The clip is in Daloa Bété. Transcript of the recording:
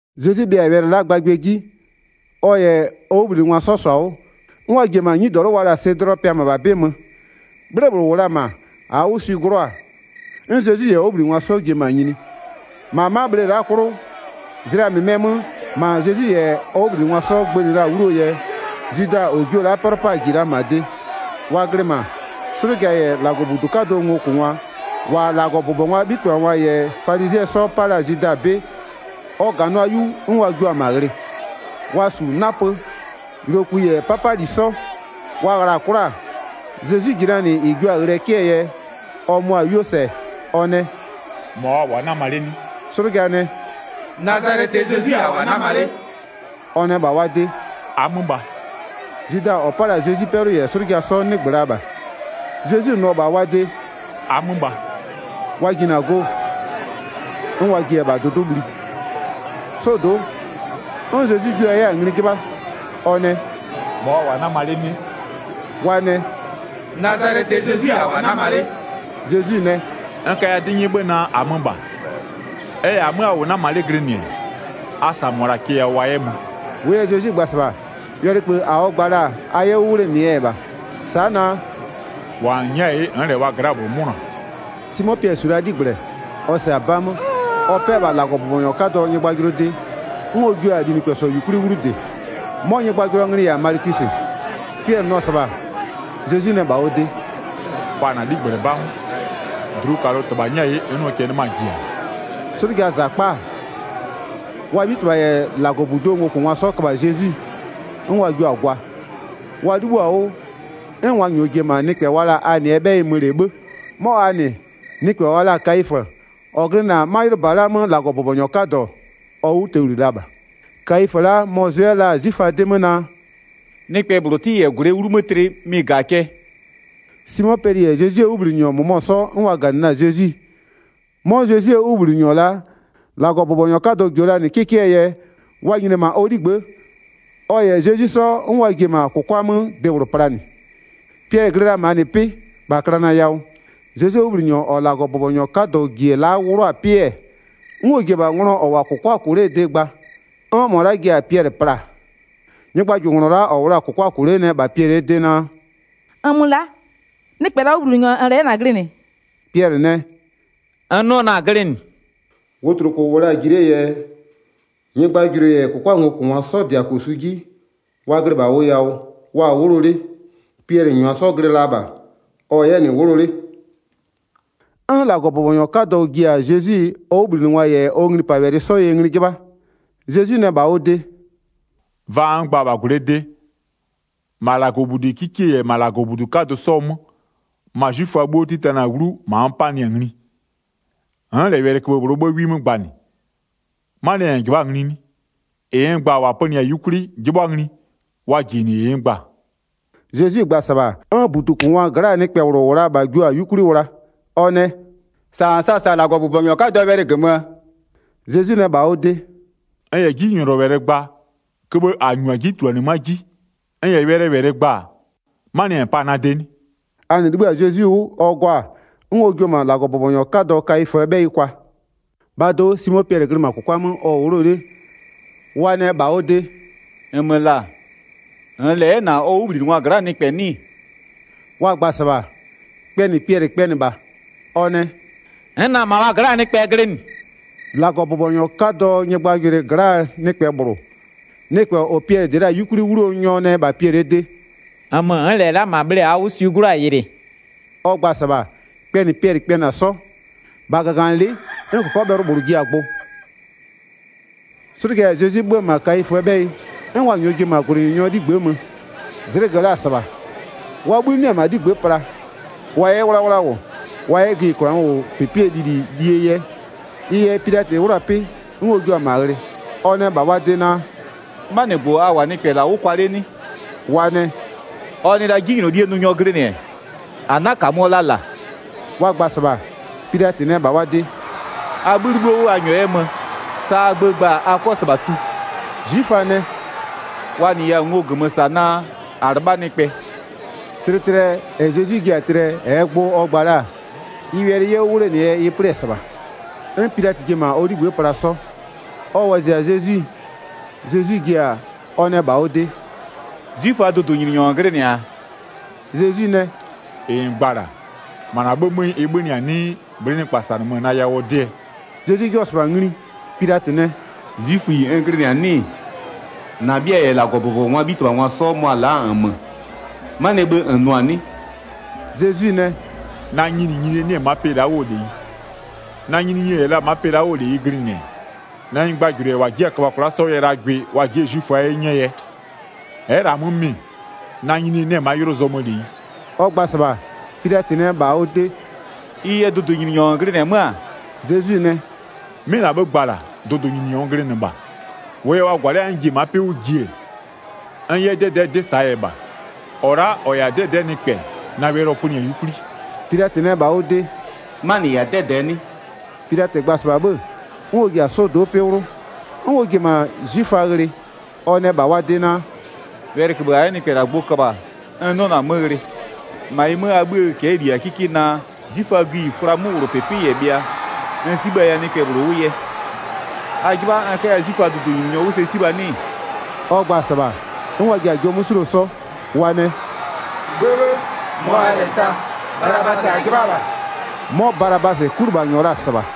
Zezwi bhɩa-a wɛlɩ la'aa gbagbɩɛ 'ji-e, ɔ -yɛ ɔ 'wʋbhlinɩngwa 'sɔ -sɔ-a 'wʋ, 'n wa ji-e -ma 'nyidɔlʋ wa la-a Sedlɔɔ pɩa -mabha 'bɩ 'mö. 'Bhle -bhlʋ -wʋ la-a -ma -aa 'wʋ swi 'glʋɔ-a, 'n Zezwi -yɛ ɔ 'wʋbhlinɩngwa 'sɔ ji-e -ma nyini. 2-Ma 'ma bhle la'aa 'klʋ, zlɩa -mɩmɩɛ 'mö, -ma Zezwi -yɛ ɔ 'wʋbhlinɩngwa 'sɔ gbënɩ la-a 'wluo yɛ, Zwida -ɔ jio-o la'a 'pɛlʋ 'paa -ji la -ma de. Wa glɩ -ma, 'slʋja -yɛ -Lagɔbudu 'kadʋɔ ngokʋngwa -wa -Lagɔbʋbɔngwaa 'bhitɩbhangwa -yɛ falizɩɛ 'sɔ 'pa la-a Zwida 'bɩ, ɔ -ganʋa 'yu 'n wa jua-a -ma ghlɩ. Wa -su 'napö, yʋlokpï -yɛ 'papali 'sɔ. Wa ghla-a 'kwla-a, Zezwi -ji la -nɩ -ɩ jio-a ghlɩɛ 'kɩɛ yɛ, ɔ mʋa-a 'yuo -sɛ, ɔ nɛ: “-Mɔ a -wʋ-a 'nama 'le 'nɩ?” 'Slʋja nɛ: “Nazalɛtɩɛ Zezwi-i -a -wʋ-a 'nama 'le.” Ɔ nɛ -bha wa de: “-Amö -bha.” Zwida -ɔ 'pa la-a Zezwi 'pɛlʋ -yɛ 'slʋja 'sɔ 'nɩgbö la -bha. Zezwi nʋ-ɔ -bha wa de: “-Amö -bha-a,” wa jinɩ-a go, 'n wa ji-e -bha dʋdʋ'ʋ bhli. 'Sɔdo'o, 'n Zezwi jua 'yɛ-a ngli 'jɩbha, ɔ nɛ: “-Mɔ a -wʋ-a 'nama 'le 'nɩ?” Wa nɛ: “Nazalɛtɩɛ Zezwi-i -a -wʋ-a 'nama 'le.” Zezwi nɛ: “N kaya 'dɩ 'nyɛ 'bhë naa: -Amö -bha. Ɛ -yɛ -amö a -wʋ 'nama 'le glɩnɩ-ɛ, a -sa -mʋa la'a cɛ yawʋ wa 'yɛ mö.” 9-Wʋʋ yɛ Zezwi gba-a -sɩbha, wɛlɩköbhë -a ɔ gba la-a, a 'yɛ 'wʋ 'wlenɩɛ yɛ -bha, sa'a naa: “-Wa -n nyɛ'ɛ-a 'ye, n'n -lɛ wa gla'aa -bhlʋ 'mʋnʋa.” Simo Piɛlɩ -su la 'ligblɛ, ɔ -sɛ-a 'ba 'mö, ɔ 'pɛ-ɛ -bha -Lagɔbʋbɔnyɔ 'kadɔɔ nyɩgbajʋlʋɔ de, 'n ɔ jio-a linɩkpɛsɔ -yukwli 'wlu -dɩ. 'Mɔ nyɩgbajʋlʋɔ nglɩ-ɩ -yɛ-a Malɩkwisɩ. Piɛlɩ nʋ-ɔ -sɩbha, Zezwi nɛ -bha ɔ de: “Fa -na 'ligblɛ 'ba 'mö, dlukalʋ -Tɩbha nyɛ'ɛ-a 'ye n 'nʋɔ cɛ 'nɩmaa ji-a?” 'Slʋjaa -zakpa-a, wa 'bhitɩbha -yɛ -Lagɔbuduo ngokʋngwa 'sɔ köbha-a Zezwi, 'n wa jio-a gwa. Wa 'libhïo-a 'wʋ, 'n wa -nyɔɔ ji-e -ma nɩkpɛ wa la-a Anɩɛ 'bhɛyɩ mö -lɛ 'bhë. 'Mɔ Anɩ, nɩkpɛ wa la-a Kayifö, -ɔ glɩnɩ-a 'ma 'ylʋba la'a 'mö -Lagɔbʋbɔnyɔ 'kadɔ, ɔ 'wʋtowli la -bha. Kayifö la'a mɔ-ɔ zʋ 'yɛ la-a 'zwiföa 'dɩ 'mö naa: “Nɩkpɛ -bhlʋ 'tɩ -yɛ -gwlɩɛ 'wlumö tlɩ mɩ-ɩ -ga-a cɛ.” Simo Piɛlɩ -yɛ Zezwie 'wʋbhlinɩnyɔ -mʋmɔ 'sɔ, 'n wa -ganɩ la-a Zezwi. 'Mɔ Zezwie 'wʋbhlinɩnyɔ la'a, -Lagɔbʋbɔnyɔ 'kadɔ -jio la -nɩ 'kɩkɩɛ yɛ, wa nyini-e -ma ɔ 'ligbë'ë, ɔ -yɛ Zezwi 'sɔ 'n wa ji-e -ma -kʋkwa 'mö debhlʋ planɩ. Piɛlɩ glɩ la -ma -nɩ 'pɩ, -bha klana yawʋ. Zezwie 'wʋbhlinɩnyɔ -ɔ -Lagɔbʋbɔnyɔ 'kadɔ -ji-e la'a 'wlʋ-a 'pɩ-ɛ, 'n ɔ ji-e -bha nglɔ -ɔ -wʋ-a -kʋkwa -kʋ 'lee de gba, 'n -mɔ la'a ji-a Piɛlɩ pla-a. Nyɩgbajʋlʋnglɔ la'a -ɔ -wʋ la-a -kʋkwa -kʋ 'le nɛ -bha Piɛlɩɛ de naa: “-Nmö la'a, nɩkpɛ -laa 'wʋbhlinɩnyɔ -nn -lɛ 'yɛ -na glɩnɩ?” Piɛlɩ nɛ: “N 'nɩɔ na-a glɩnɩ.” Wotloko -wʋ la-a ji 'lee yɛ, nyɩgbajʋlʋɩ -yɛ -kʋkwaa ngokʋngwa 'sɔ -dɩ-a -kosu 'ji, wa glɩ -bha ʋ yawʋ, wa-a 'wʋlɔ 'le, Piɛlɩ -nyʋa 'sɔ glɩ la -bha, ɔ-ɔ 'yɛ -nɩ 'wʋlɔ 'le. 'N -Lagɔbʋbɔnyɔ 'kadɔ ji-a Zezwi ɔ 'wʋbhlinɩngwa -yɛ ɔ nglipawɛlɩ 'sɔɔ yɛ ngli 'jɩbha. Zezwi nɛ -bha ɔ de: “Vaa n gba-a -bha -gwlɩɛ de, -ma -Lagɔbudi 'kikie -yɛ -Lagɔbudu 'kadʋ 'sɔɔ 'mö, ma 'zwiföa 'bhuo 'titanɩ-a 'wlu -ma n 'panɩ-a ngli, n'n -lɛ wɛlɩköbhë -bhlʋɔ 'bhë 'wi 'mö gbanɩ. 'Manɩɛ yɛ -n -jɩbha'a-a ngli 'nɩ? -Ɩ n gba-a -wa pönɩɩ-a 'yukwli, 'jɩbhʋa ngli wa -ji-e -nɩ -ɩ n gba-a.” Zezwi gba-a -sɩbha, 'n -budukʋngwaa gla'aa nɩkpɛ -bhlʋ -wʋ la-a -bha jio-a 'yukwli wla. Ɔ nɛ: “-Sa -n sa-a -sa -Lagɔbʋbɔnyɔ 'kadɔɔ wɛlɩ -gömöö?” Zezwi nɛ -bha ɔ de: “N -yɛ 'jinylɔwɛlɩ gba, köbhë -a -nyu-a 'ji -tuluanɩmö'öa 'ji, 'n n -yɛ wɛlɩɛ -wɛlɩ gba, 'manɩɛ yɛ -n pa-a na de 'nɩ?” Anɩ 'libhï-a Zezwi 'wʋ, ɔ 'gɔ-a, 'n ɔ jio-o -ma -Lagɔbʋbɔnyɔ 'kadɔ Kayiföö 'bhɛyɩ kwa. Piɛlɩ yɛ Zezwie -jijigbʋ 'mö kpɛnɩ 'sɔ 25-Bhaa do'o Simo Piɛlɩ glɩ -ma -kʋkwa 'mö ɔ-ɔ 'wʋlɔ 'le. Wa nɛ -bha ɔ de: “-Nmö -la, -nn -lɛ 'yɛ -na ɔ 'wʋbhlinɩngwa gla'aa nɩkpɛ 'nɩ-ɩ?” Wa gba-a -sɩbha, kpɛnɩ Piɛlɩ kpɛnɩ -bha. Ɔ nɛ: “N'n na-a -ma wa gla'aa nɩkpɛ glɩnɩ.” 26-Lagɔbʋbɔnyɔ 'kadɔɔ nyɩgbajʋlʋɩ gla'aa nɩkpɛ -bhlʋ, nɩkpɛ -ɔ Piɛlɩ -dɩ la-a 'yukwli 'wluo nyɔ nɛ -bha Piɛlɩɛ de: “-Nmö n'n -lɛ la'a -ma bhle -aa 'wʋ swi 'glʋɔ-a yɩlɩ?” Ɔ gba-a -sɩbha, kpɛnɩ Piɛlɩ kpɛnɩ-a 'sɔ. -Bha -gaganɩlɩ'ɩ 'n -kɔkɔbhɛlʋ -bhlʋ ji-a gbʋ. 'Slʋja -yɛ Zezwi 'bhö-ö -ma Kayiföö 'bhɛyɩ, 'n wa -nyɔɔ ji-e -ma -gwlɩnyininyɔɔ 'ligbë'ë mö. Zlɩgö la-a -sɩbha. Wa 'bhï 'nɩ-ɛ -ma 'ligbë'ë pla, wa 'yɛ 'wlawla -wʋ wa 'yɛ gïyikwlaa 'möwlʋpɩpɩɛ lili lie yɛ. Ɩ yɛ Pilatɩ 'wlʋ-a 'pɩ, 'n ɔ jua-a -ma ghlɩ. Ɔ nɛ -bha wa de naa: “'Manɩgbʋ a -wʋ-a nɩkpɛ -la 'wʋ kwa 'le 'nɩ?” Wa nɛ: “Ɔ nɩ la 'jinylolie nʋnyɔ glɩnɩ-ɛ, -a 'na -kamöɔ la -la.” Wa gba-a -sɩbha, Pilatɩ nɛ -bha wa de: “A 'bhï 'libhïo 'wʋ a -nyɔɔ 'yɛ mö, sa a gbö gba-a a 'kɔ -sɩbha tu.” 'Zwiföa nɛ: “Wa -nɩya-a ngo -gömö -sa naa, -a 'lɩbha nɩkpɛ.” Tlɩtlɩɛ -ɛ Zezwi ji-a tlɩɛ, -ɛɛ gbʋ ɔ gba la-a, ɩ wɛlɩ 'yɛ 'wʋ 'wlenɩɛ yɛ ɩ 'plɩ-ɛ -sɩbha. 'N Pilatɩ ji-e -ma ɔ 'ligbë'ë pla 'sɔ. Ɔ wɔzɩ-a Zezwi, Zezwi ji-a, ɔ nɛ -bha ɔ de: “'Zwiföaa dʋdʋnyininyɔ -n glɩnɩ-a?” Zezwi nɛ: “-Ɩ -n gba-a -la, -ma -na 'bhë 'mö ɩ 'bhönɩ-a 'nɩɩ, bhlɩ'ɩ nɩkpa -sanɩmö-a na yawʋɔ 'dɩɛ?” Zezwi 'jɩbhɔ-ɔ -sɩbha ngli, Pilatɩ nɛ: “'Zwiföyi n glɩnɩ-a 'nɩɩ? -Na 'bhɩa -yɛ -Lagɔbʋbɔngwaa 'bhitɩbhangwa 'sɔ, mʋa-a la'a-a -nmö, 'manɩɛ bhë -n nʋ-a 'nɩ?” Zezwi nɛ: “Na nyininyinie 'nɩ-ɛ ma'a pɩ la'a 'wʋɔ -leyi. Na nyininyinie -yɛ la ma'a pɩ la'a 'wʋɔ -leyi glɩnɩ-ɛ, na nyɩgbajʋlʋɩ -yɛ -wa ji'i-a köbha kwla'a 'sɔ yɛ la gwɩ, wa ji'i-e 'zwiföa 'ye 'nyɛɛ yɛ. Ɛ'ɛ -lɛ-a 'mö mɩ-ɩ, na nyininyinie 'nɩ-ɛ ma'a 'ylʋ zɔmöö -leyi.” Ɔ gba-a -sɩbha, Pilatɩ nɛ -bha ɔ de: “Ɩ yɛ dʋdʋnyininyɔ -n glɩnɩ-ɛ 'mö-a?” Zezwi nɛ: “'Mɩ -na 'bhë gba-a -la, dʋdʋnyininyɔ n glɩnɩ -bha. -Wʋʋ yɛ wa -gwalɩ'ɩ-a 'n n ji-e ma'a 'pɩ 'wʋ ji-e, n 'yɛ 'dɛdɛ'ɛɛ 'dɩ -saa yɛ -bha. -Ɔ la'a -ɔ -yɛ-a 'dɛdɛ'ɛɛ nɩkpɛ, na wɛlɩ ɔ pönɩ-a 'yukwli.” Pilatɩ nɛ -bha ɔ de: “'Manɩ -yɛ-a 'dɛdɛɛ 'nɩ?” Pilatɩ gba-a -sɩbha 'bhë, 'n ɔ ji-a 'sɔdo'o 'pɩ 'wlʋ, 'n ɔ ji-e -ma 'zwiföa ghlɩ. Ɔ nɛ -bha wa de naa: “Wɛlɩköbhë -a 'yɛ nɩkpɛ -la gbʋ köbha-a n 'nɩɔ-ɔ na-a 'mö ghlɩ. 39-Ma ɩ 'mö, a 'bhïë cɛ'ɛɛ -li-a 'kɩkɩ naa, 'zwiföaa gïyikwlaa 'möwlʋpɩpɩ -yɛ bhɩa n 'sibhaya nɩkpɛ -bhlʋ 'wʋ yɛ. A 'jɩbha n 'kaya 'zwiföaa dʋdʋnyininyɔ 'wʋ sɛ 'sibha 'nɩ-ɩ?” Ɔ gba-a -sɩbha, 'n wa ji-a jɔ 'mö 'suluo 'sɔ, wa nɛ: “'Bhëbhë, mɔ -aa -lɛ sa, Balabasɩ -a 'jɩbha -bha.” 'Mɔ Balabasɩ, 'kulɩbhanyɔ la-a -sɩbha.